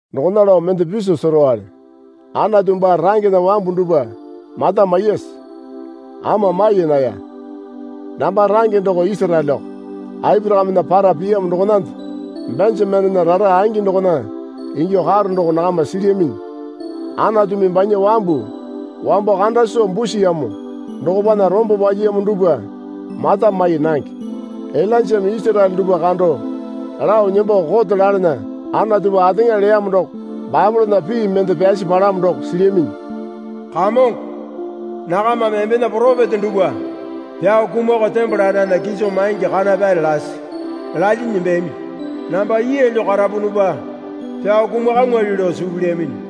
Dokona lao mende piso serowale, Anatu baa rangena wambu dupwa mata maiyase? Ama mai naya. Namba range doko Isaraeleko Aporakamena para piyamo dokonande. Benjamenena rara angi dokona ingyuo karo doko nakama silyaminyi. Anatumi banya wambu wambo kanda soo busiyamo dokopana rombo palyiyamo dupwa mata mai nange. Ilainjame Isaraele dupwa kando lao nembo kote lalana Anatupa ateŋa leyamo doko Baepolena pii mende pyasi palamo doko silyaminyi. Kamongo, nakamame embena poropeta dupwa pyao kumakao tembole andana kiso maingi kana pyare lasi lalyinyi nembeyami. Namba yeelyo karapunupa pyao kumakamwali lao suu pilyaminyi.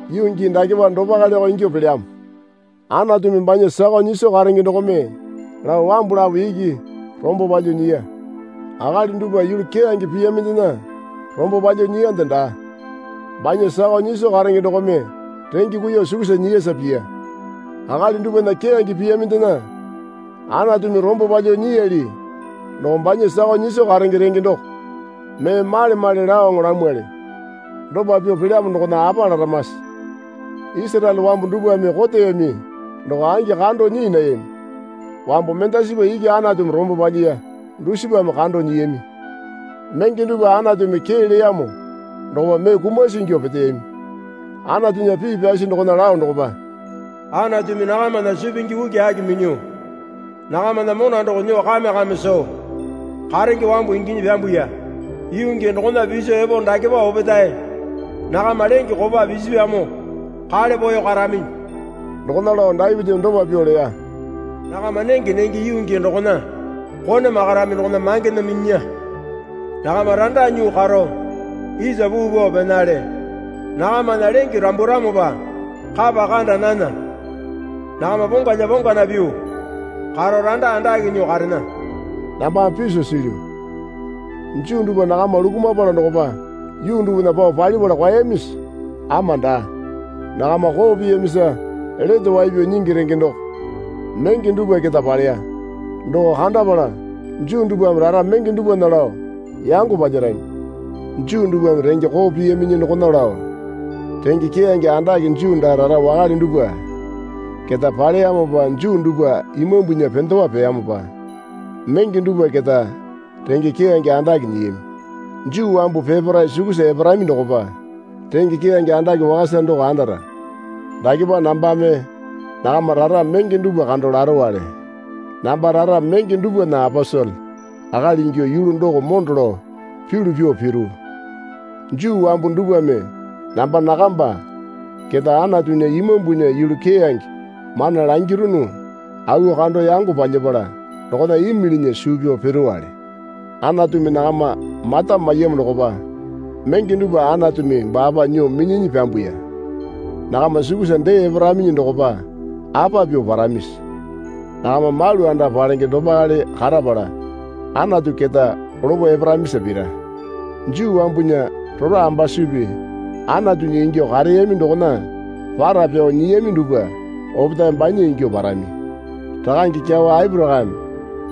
Yuu gii dakepa dopaleko ingyuo pelyamo. Anatumi banya sakao nyiso karenge dokome lao wambu lapo iki rombo palyuo nyiya. Akali dupwa yulu keyange piyamindena rombo palyuo nyiyande daa. Banya sakao nyiso karenge dokome renge kuiyuo sukusa nyiyasa piya. Akali dupwana keyange piyamindena Anatumi rombo palyuo nyiyali doko banya sakao nyiso karenge renge doko mee male male laoŋo lamwali. Dopa pyuo pelyamo dokona apa laramase? Isaraele wambu dupwame koteyami doko angi kando nyii nayami. Wambu mendasipa iki Anatumi rombo palyiya dusipame kando nyiyami. Menge dupwa Anatumi kee leyamo dokopa mee kumasi ingyuo peteyami. Anatunya pii pyasi dokona lao dokopa, Anatumi nakamana suu pingi ukiaki minyuo nakamana mona doko nyuo kame kame soo karenge wambu inginyi pyambuya. Yuu gii dokona piso epo dakepa opetae nakama lenge kopa pisipyamo kale poeyo karaminyi. Dokona lao Dapitimi dopa pyuo leya. Nakama nenge nenge yuu gii dokona kone makarami dokona mangena minyinya. Nakama randa nyuo karo isa puu pao penale. Nakamana lenge ramburamopa kapa kanda nana. Nakama pongalya pongana pyuo karo randa andake nyuo karena. Nambame piso silyu. Juu dupwa nakama lukumapala dokopa yuu dupwana pao palipala kwaeyamisi? Ama daa. Nakama koo piyamisa lete wai pyao nyingi renge doko menge dupwa keta paleya. Doko kandapala Juu dupwame rara menge dupwana lao yango palyarami. Juu dupwame renge koo piyaminyi dokona lao renge keyange andake Juu daa rara wakale dupwa keta paleyamopa Juu dupwa imambunya pendewa peyamopa menge dupwa keta renge keyange andake nyiyami. Juu wambu peparae sukusa eparami dokopa renge keyange andake wakasa doko andara. Dakepa nambame nakama rara menge dupwa kando larowale. Namba rara menge dupwana aposele akali ingyuo yulu doko mondo lao pyulu pyuo piru. Juu wambu dupwame namba nakamba keta Anatunya Imambunya yulu keyange mana langirunu auwo kando yango palyapala dokona imilinya suu pyao piruwale. Anatumi nakama mata maiyamo dokopa menge dupwa Anatumi baapa nyuo minyinyi pyambuya. Nakama sukusa dee eparaminyi dokopa apa pyuo paramisi? Nakama malu anda palenge dopakale karapala Anatu keta lopo eparamisa pira. Juu wambunya rora ambasupi Anatunya ingyuo kareyami dokona para pyao nyiyami dupwa opetae banya ingyuo parami. Rakange kyawa Aporakame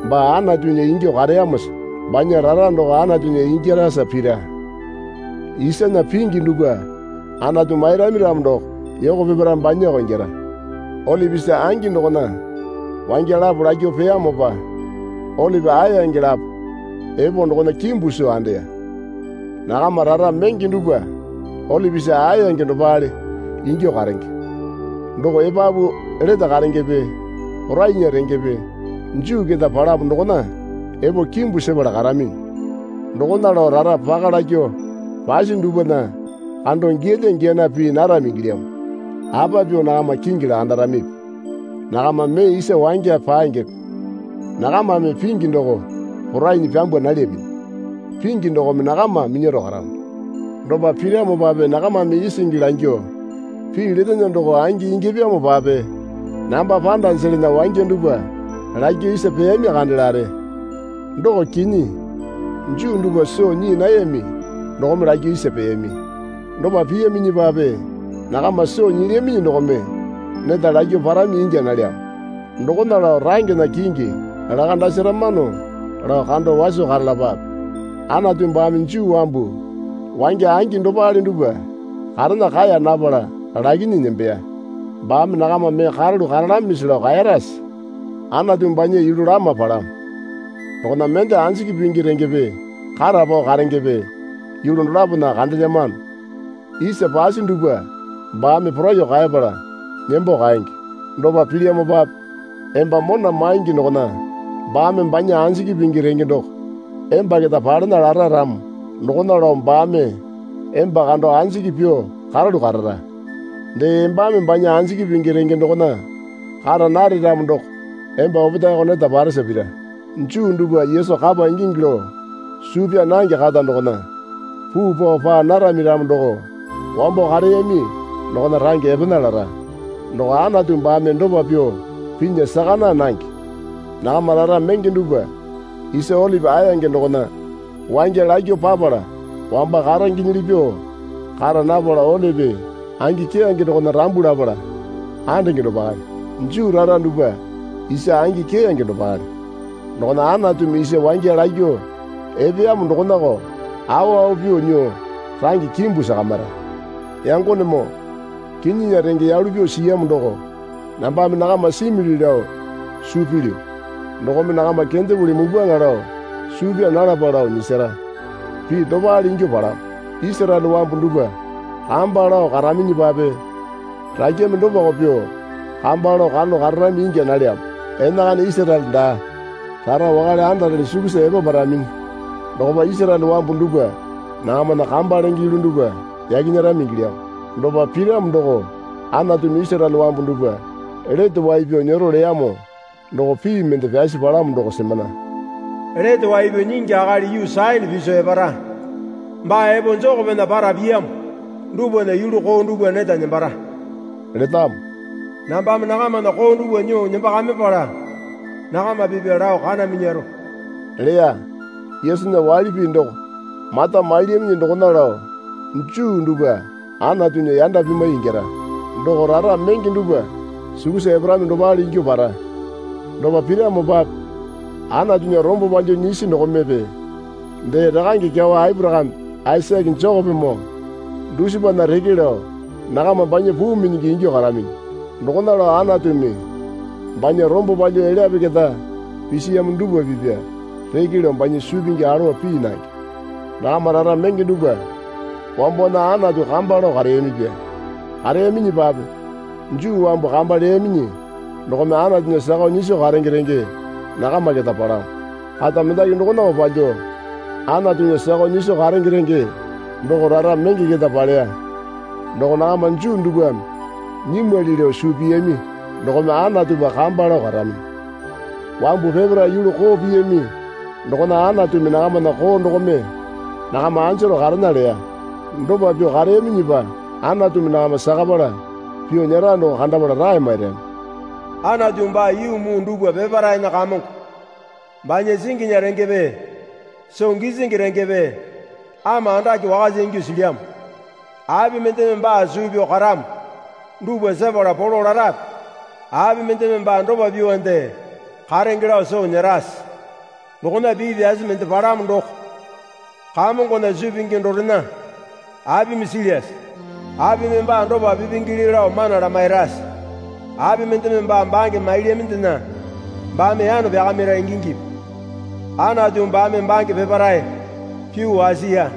baa Anatunya ingyuo kareyamosa banya rara doko Anatunya ingyarasa pira. Isana pingi dupwa Anatu mairami ramo doko yoko peparae banyako ingyara. Olipi isa angi dokona wangya lapo lakyuo peyamopa olipi aeyange lapo epo dokona kimbu soo andeya. Nakamba rara menge dupwa olipi isa aeyange dopakale ingyuo karenge. Doko epapu lete karengepe porainya rengepe Juu keta palamo dokona epo kimbu sepala karaminyi. Dokona lao rara paka lakyuo pasi dupwana kando giyalya giyana pii narami ingilyamo. Apa pyuo nakama kingi lakandaramipi? Nakama mee isa wangya pangepe. Nakamame pingi doko porainyi pyambwa nalyaminyi. Pingi dokome nakama minyaro karamo. Dopa piramopape nakamame isingi langyuo, Pii letene doko angi ingyapyamopape namba panda jelana wangya dupwa lakyuo isa peyami kanda lare. Doko kinyi. Juu dupwa soo nyii nayami dokome lakyuo isa peyami. Dopa piyaminyipape nakama soo nyilyaminyi dokome neta lakyuo parami ingya nalyamo. Dokona lao rangena kingi lakandsaramano lao kando waso karalapape. Anatu baame Juu wambu wangya angi dopale dupwa karena kaeya napala lakinyi nembeya. Baame nakama mee karalu karalamisi lao kaerase? Anatu banya yulu lama palamo. Dokona mende anjiki pingi rengepe kata pao karengepe yulu dolapona kandelyamano. Isa pasi dupwa baame poraiyuo kaepala nembo kaenge. Dopa pilyamopape emba mona maingi dokona baame banya anjiki pingi renge doko emba keta palena lara ramo dokona lao baame emba kando anjiki pyuo karalu karara. Dee embame banya anjiki pingi renge dokona kara nare ramo doko emba opetaeko neta paresa pira. Juu dupwa Yesu kapa ingingi lao suu pyaa nange kata dokona puu pao paa narami ramo doko wambo kareyami dokona range epena lara. Doko Anatu baame dopa pyuo pinya saka naa nange. Nakama rara menge dupwa isa olipi aeyange dokona wangya lakyuo papala wamba karengenyili pyuo kara napala olipi angi keyange dokona rambu lapala andenge dopakale. Juu rara dupwa isa angi keyange dopakale. Dokona Anatumi isa wangya lakyuo epeyamo dokonako awa awa pyuo nyuo range kimbu sakamira. Yangonemoo kinyinya renge yalu pyuo siyamo doko nambame nakama simili lao suu pilyu. Dokome nakama kendepuli mupwaŋa lao suu pyaa nalapa lao nyisara. Pii dopale ingyuo palamo. Isaraele wambu dupwa kamba lao karaminyipape rakyame dopako pyuo kamba lao karalu kararami ingya nalyamo. Enakana Isaraele daa rara wakale andarele sukusa epaparaminyi dokopa Isaraele wambu dupwa nakamana kamba lenge yulu dupwa yaki nyerami ingilyamo. Dopa piramo doko Anatumi Isaraele wambu dupwa lete wai pyao nyero leyamo doko pii mende pyasi palamo doko semana. Lete Wai Pyao Nyingi Akali yuu Sayone piso epara. Baa epo Jekopena para piyamo dupwana yulu koo dupwa neta nembara letamo. Nambame nakamana koo dupwa nyuo nembakamipala nakama pipya lao kana minyaro leya. Yesunya waili pii doko mata mailyaminyi dokona lao Juu dupwa Anatunya yanda pimwai ingyara. Doko rara menge dupwa sukusa eparami dopale ingyuo para. Dopa piramopape Anatunya rombo palyuo nyisi dokomepe dee rakange kyawa Aporakame Aisake Jekopemoo dusipana reke lao nakama banya puu minyingi ingyuo karaminyi. Dokona lao Anatumi banya rombo palyuo elyape keta pisiyamo dupwa pipya reke lao banya suu pingi alowa pii nange. Nakama rara menge dupwa wambowana Anatu kamba lao kareyamipya. Kareyaminyipape Juu wambu kamba leyaminyi dokome Anatunya sakao nyiso karenge renge nakama keta palamo. Kata mendaki dokonako palyuo Anatunya sakao nyiso karenge renge doko rara menge keta paleya. Doko nakama Juu dupwame nyimwali lao suu pyami dokome Anatupa kamba lao karaminyi. Wambu peparae yulu koo piyami dokona Anatumi nakamana koo dokome nakama anjaro karena leya. Dopa pyuo kareyaminyipa Anatumi nakama sakapala pyuo nyera doko kandapala rae mairami. Anatu baa yuu muu dupwa peparaena Kamongo. Banya singinya rengepe soo gisingi rengepe ama andake wakasa ingyuo silyamo. Api mendeme baa suu pyao karamo dupwa sepala polo larape? Api mendeme baa dopa pyuonde karenge lao soo nyerase? Dokona pii pyasi mende palamo doko, Kamongona suu pingi dorena apimi silyase? Apimi baa dopa pipingili lao mana lamairase? Api mendeme baa bange mailyamindena baame yano pyakamira ingingipi? Anatu baame bange peparae pyuo wasiya.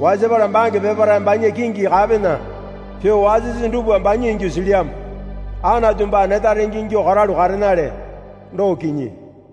Wasapala bange peparae banya kingi kapena pyuo wasisi dupwa banya ingyuo silyamo. Anatu baa neta renge ingyuo karalu karenale, doko kinyi.